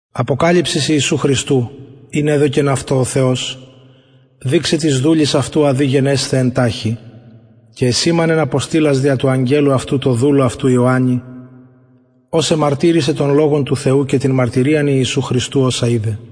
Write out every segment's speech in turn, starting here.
αποκαλυψις ιησου χριστου ην εδωκεν αυτω ο θεος δειξαι τοις δουλοις αυτου α δει γενεσθαι εν ταχει και εσημανεν αποστειλας δια του αγγελου αυτου τω δουλω αυτου ιωαννη ος εμαρτυρησεν τον λογον του θεου και την μαρτυριαν ιησου χριστου οσα ειδεν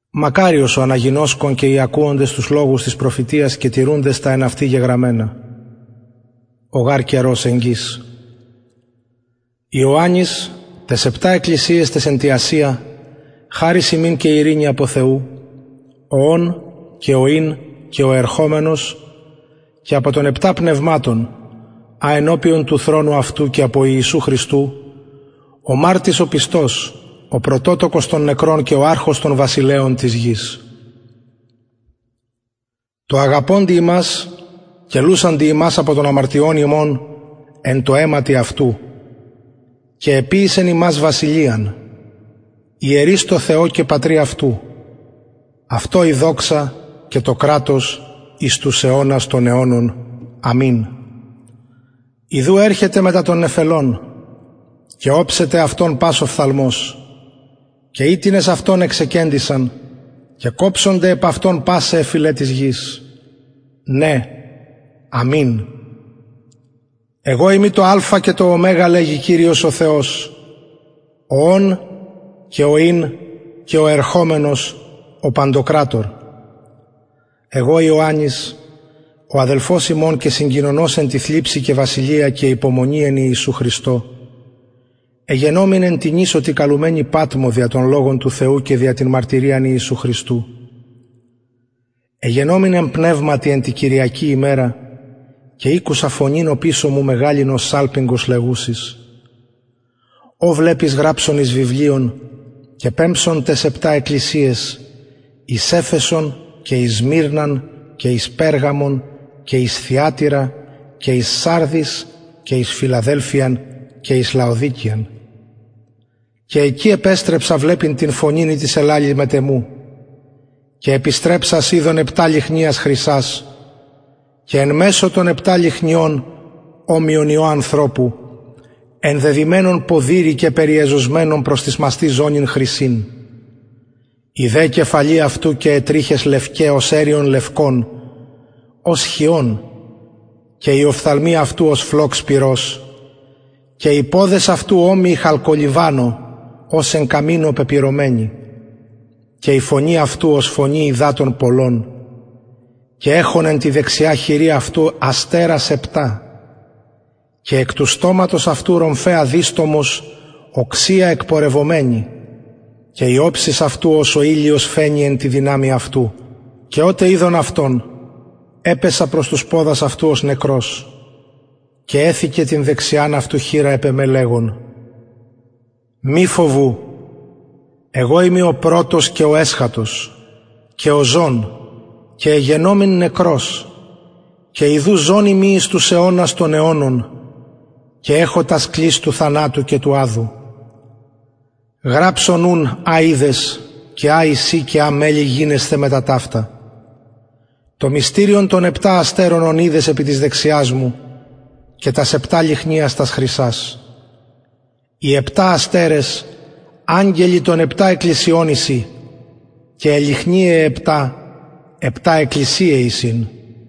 μακαριος ο αναγινωσκων και οι ακουοντες τους λογους της προφητειας και τηρουντες τα εν αυτη γεγραμμενα ο γαρ καιρος εγγυς ιωαννης ταις επτα εκκλησιαις ταις εν τη ασια χαρις υμιν και ειρηνη απο θεου ο ων και ο ην και ο ερχομενος και απο των επτα πνευματων α ενωπιον του θρονου αυτου και απο ιησου χριστου ο μαρτυς ο πιστος ο πρωτοτοκος των νεκρων και ο αρχων των βασιλεων της γης τω αγαπωντι ημας και λουσαντι ημας απο των αμαρτιων ημων εν τω αιματι αυτου και εποιησεν ημας βασιλειαν ιερεις τω θεω και πατρι αυτου αυτω η δοξα και το κρατος εις τους αιωνας των αιωνων αμην ιδου ερχεται μετα των νεφελων και οψεται αυτον πας οφθαλμος και οιτινες αυτον εξεκεντησαν και κοψονται επ αυτον πασαι αι φυλαι της γης ναι αμην εγω ειμι το αλφα και το ω λεγει κυριος ο θεος ο ων και ο ην και ο ερχομενος ο παντοκρατωρ εγω ιωαννης ο αδελφος υμων και κοινωνος εν τη θλιψει και βασιλεια και υπομονη εν χριστω ιησου εγενομην εν τη νησω τη καλουμενη πατμω δια τον λογον του θεου και δια την μαρτυριαν ιησου χριστου εγενομην εν πνευματι εν τη κυριακη ημερα και ηκουσα φωνην οπισω μου μεγαλην ως σαλπιγγος λεγουσης ο βλεπεις γραψον εις βιβλιον και πεμψον ταις επτα εκκλησιαις εις εφεσον και εις σμυρναν και εις περγαμον και εις θυατειρα και εις σαρδεις και εις φιλαδελφειαν και εις λαοδικειαν και εκει επεστρεψα βλεπειν την φωνην ητις ελαλει μετ εμου και επιστρεψας ειδον επτα λυχνιας χρυσας και εν μεσω των επτα λυχνιων ομοιον υιω ανθρωπου ενδεδυμενον ποδηρη και περιεζωσμενον προς τοις μαστοις ζωνην χρυσην η δε κεφαλη αυτου και αι τριχες λευκαι ως εριον λευκον ως χιων και οι οφθαλμοι αυτου ως φλοξ πυρος και οι ποδες αυτου ομοιοι χαλκολιβανω ως εν καμινω πεπυρωμενοι και η φωνη αυτου ως φωνη υδατων πολλων και εχων εν τη δεξια αυτου χειρι αστερας επτα και εκ του στοματος αυτου ρομφαια διστομος οξεια εκπορευομενη και η οψις αυτου ως ο ηλιος φαινει εν τη δυναμει αυτου και οτε ειδον αυτον επεσα προς τους ποδας αυτου ως νεκρος και εθηκεν την δεξιαν αυτου επ εμε λεγων μη φοβου εγω ειμι ο πρωτος και ο εσχατος και ο ζων και εγενομην νεκρος και ιδου ζων ειμι εις τους αιωνας των αιωνων αμην και εχω τας κλεις του θανατου και του αδου γραψον ουν α ειδες και α εισιν και α μελλει γινεσθαι μετα ταυτα το μυστηριον των επτα αστερων ων ειδες επι της δεξιας μου και τας επτα λυχνιας τας χρυσας οι επτα αστερες αγγελοι των επτα εκκλησιων εισιν και αι λυχνιαι αι επτα επτα εκκλησιαι εισιν